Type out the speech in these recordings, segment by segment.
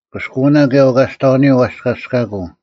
ᑭᔅᑯᐅᓇ ᑭᔭ ᐅᑲᔅᑕᐅᓂᔪᐤ ᐛᔅᑲᔅᑲᑯᐤ: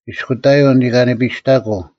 ᐃᔅᑯᑕᔪᐤ ᓂᑲᓂᐸᔨᔅᑕᑯᐤ,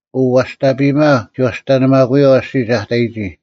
ᐅ ᐛᔅᑕᐱᔨᒪ ᒋ ᐛᔅᑕᓂᒪᑯᔪᐛ ᐊᔅᒋᒡ ᐊ ᑕᔨᒋ: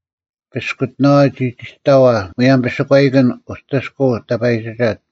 ᐱᔅᑯᑎᓇᐛ ᒋ ᑎᒋᑕᐛ ᒧᔭᒻ ᐱᓴᒂᐃᑭᓐ ᐅᑎᔅᑯᐤ ᑕᐸᔨᒋᒐᑦ,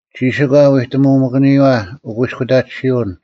ᒋᓯᒂ ᐎᑎᒧᒪᑭᓂᔪᐛ ᐅᑯᐃᔅᑯᑕᑎᓯᐅᓐ,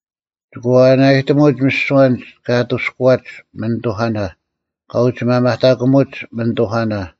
ᒋᑭ ᐛᐛᓇᔨᑎᒧᒡ ᒥᓯᐛ ᐊᓐᒡ ᑲ ᐊᑐᔅᑯᐛᒡ ᒥᓂᑐᐧᑲᓇ, ᑲ ᐅᒋ ᒪᒪᑕᑯᒧᒡ ᒥᓂᑐᐧᑲᓇ: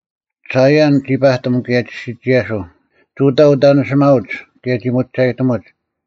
ᓴᐃᔭᓐ ᒋ ᐸᑎᒻ, ᑭᔭ ᒋ ᓯᒋᔭᓱᐤ; ᒍᑕ ᐅᑕᓂᓯᒪᐅᒡ ᑭᔭ ᒋ ᒧᒋᒐᔨᑎᒧᒡ,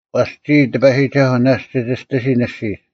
ᐛᔅ ᒋᔾ, ᑎᐸᔨᒋᒐᓱᐤ, ᓇᔅᒡ ᒋ ᒋᔅᑎᓯᓐ ᐊᔅᒋᒡ: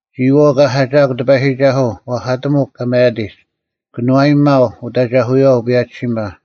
ᒋᔨᐛᐤ ᑲ ᓴᒋᐊᒃ ᑎᐸᔨᒋᒐᓱᐤ, ᐛᐧᑲᑎᒧᒄ ᑲ ᒪᔭᑎᒡ: ᑭᓄᐛᔨᒥᒪᐤ ᐅᑦ ᐊᒐᐧᑯᔪᐛ ᐅᐸᔭᒋᓯᒪ;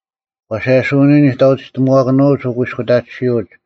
ᐛᓴᔭᓯᐅᓂᔪᐤ ᓂᑕᐅᒋᑕᒪᐛᑭᓄᐅᒡ ᐅᑯᐃᔅᑯᑕᑎᓯᐅᒡ,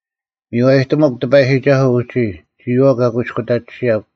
ᒥᔽᔨᑎᒧᒄ ᑎᐸᔨᒋᒐᓱᐤ ᐅᒋ, ᒋᔨᐛᐤ ᑲ ᑯᐃᔅᑯᑕᑎᓯᔭᒄ;